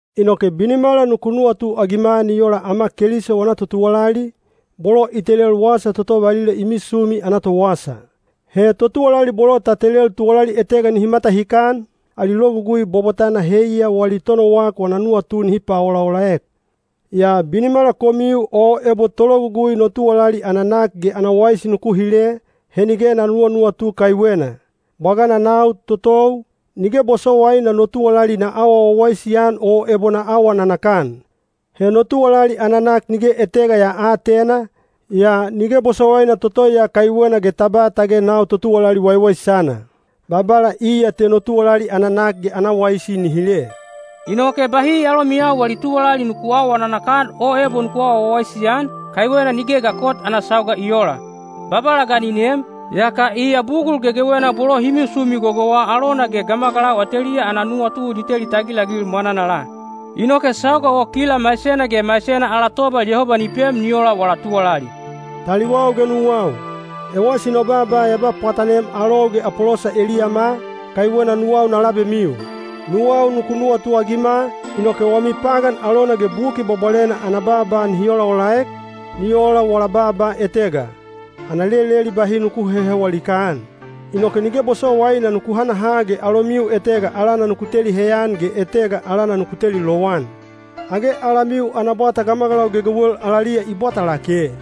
Inoke binimala nuku nuwatuagima ni ola ama Keliso wana totuwalali, bolo i telel wasa toto valila i misumi ana towasa. He totuwalali bolo ta telel tuwalali etega nihi matahikan, ali logugui bwabwatana heiya wali tonowak wana nuwatu nihi paolaolaek. Yaa binimala komiu o ebo tologugui no tuwalali ana nak ge ana waisi nuku hile, he nige na nuwanuwatu kaiwena. Bwagana nau totou, nige bosowaina no tuwalali na awa wawaisi-an o ebo na awa nanakan. He no tuwalali ana nak nige etega ya aatena, yaa nige bosowaina toto ya kaiwena ge ta ba tage nau totuwalali waiwaisana. Babala iya te no tuwalali ana nak ge ana waisi ni hile. Inoke bahi alomiyau wali tuwalali nuku aawa nanakan o ebo nuku aawa wawaisi-an, kaiwena nigeya ga kot ana sauga i oola. Babala ga ni nem, yaka iya bugul gegewena bolo hi misumi gogouwa alona ge gamagalau ateliya ana nuwatu ni teli tagilagil mwananala. Inoke sauga o kila maisena ge maisena ala tobal Yehoba ni pem ni ola wala tuwalali. Taliwau ge nuwau, ewasi no baaba ya ba pwatanem alou ge Apolosa eliyama, kaiwena nuwau na labemiu. Nuwau nuku nuwatuagima, inoke wami pagan alona ge Buki Bwabwalena ana baaba nihi olaolaek, ni ola wala baaba etega, “Ana leleli bahi nuku hehewa likaan.” Inoke nige bosowaina nuku hanaha ge alomiu etega alana nuku teli heyan ge etega alana nuku teli lowan. Age alamiu ana bwata gamagalau gegewel alaliya i bwata lake?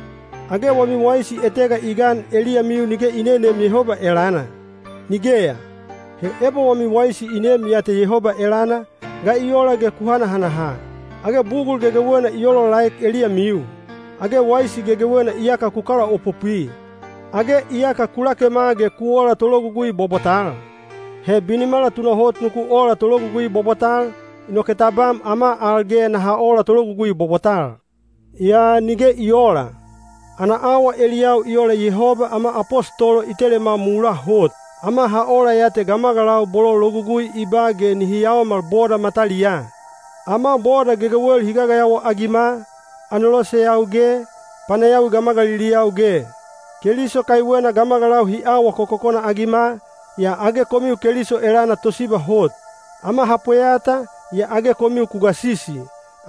Age wami waisi etega i gan eliyamiu nige i neneem Yehoba elana? Nigeya! He ebo wami waisi i neem ya te Yehoba elana, ga i ola ge ku hanahanaha? Age bugul gegewena i olaolaek eliyamiu? Age waisi gegewena iyaka ku kalaopopwi? Age iyaka ku lakema ge ku ola tologugui bwabwatal? He binimala tunahot nuku ola tologugui bwabwatal, inoke tabam ama al ge naha ola tologugui bwabwatal. Yaa nige i oola. Ana awa eliyau i ola Yehoba ama apostolo i telema mulaa hot. Ama ha ola ya te gamagalau bolo logugui i ba ge nihi yaomal boda mataliyaa. Ama boda gegewel hi gagayawa-agima, aneloseyau ge, panayawi gamagaliliyau ge. Keliso kaiwena gamagalau hi awa kokokona-agima, yaa age komiu Keliso elana tosiba hot! Ama ha pweyata, yaa age komiu ku gasisi!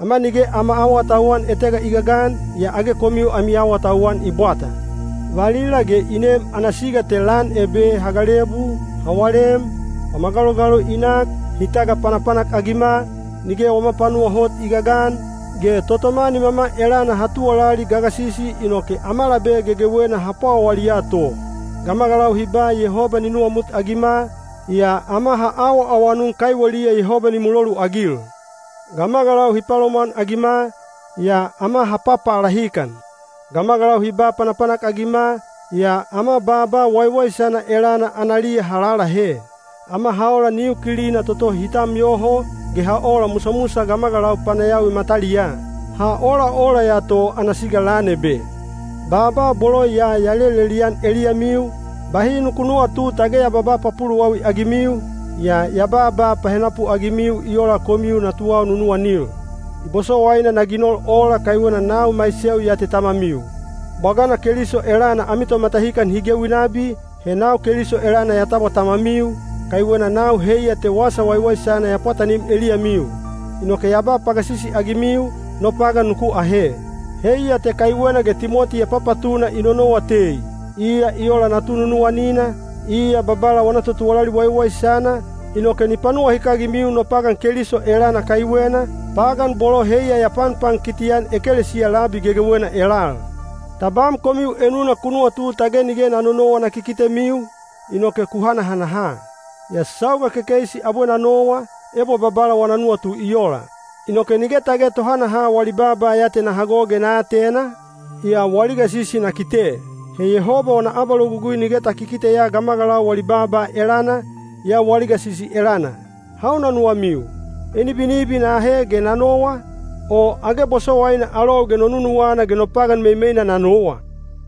Ama nige ama awatauwan etega i gagan, yaa age komiu ami awatauwan i bwata! Valila ge i nem ana siga te lan ebe ha galebu, ha walem, wama galogaloi i nak, hi tagapanapanak-agima, nige wama panuwa hot i gagan, ge totoma nimama elana ha tuwalali gagasisi inoke ama labe gegewena ha pwawaliya to. Gamagalau hi ba Yehoba ni nuwamutagima, yaa ama ha awaawanun kaiweliya Yehoba ni muloluagil. Gamagalau hi palomwanagima, yaa ama ha papalahikan. Gamagalau hi ba panapanak-agima, yaa ama baaba waiwaisana elana analiya ha lalahe. Ama ha ola niu kilina toto hi tam yoho, ge ha ola musamusa gamagalau panayawi mataliyaa. Ha olaola ya to ana siga lan ebe. Baaba bolo ya ya lelelian eliyamiu, bahi nuku nuwatu tage ya babaa papuluwawi-agimiu, yaa ya babaa pahenapu-agimiu i ola komiu natuwau nunuwanil. I bosowaina na ginol ola kaiwena nau maiseu ya tamamiu. Bwagana Keliso elana ami tomatahikan hi gewi nabi, he nau Keliso elana ya tabwa tamamiu, kaiwena nau heiya te Wasa Waiwaisana ya pwatanim eliyamiu. Inoke ya ba pagasisi-agimiu, no pagan nuku ahe. Heiya te kaiwena ge Timoti ya papatuna i nonowa tei. Iya i ola natu nunuwanina, iya Babala wana totuwalali waiwaisana, inoke ni panuwahikagimiu no pagan Keliso elana kaiwena, pagan bolo heiya ya panpankiti-an ekelesiya labi gegewena elal. Tabam komiu enuna ku nuwatu tage nige na nonowa na kikitemiu, inoke ku hanahanaha. Yaa sauga kekeisi abwe na nowa, ebo Babala wana nuwatu i ola. Inoke nige tage tohanaha wali baaba ya te na hago ge na atena, yaa wali gasisi na kite. He Yehoba wana abalogugui nige ta kikiteya gamagalau wali baaba elana, yaa wali gasisi elana. Hauna nuwamiu? Enibinibi na ahe ge na nowa, o age bosowaina alou ge no nunuwana ge no pagan meimeina na nowa?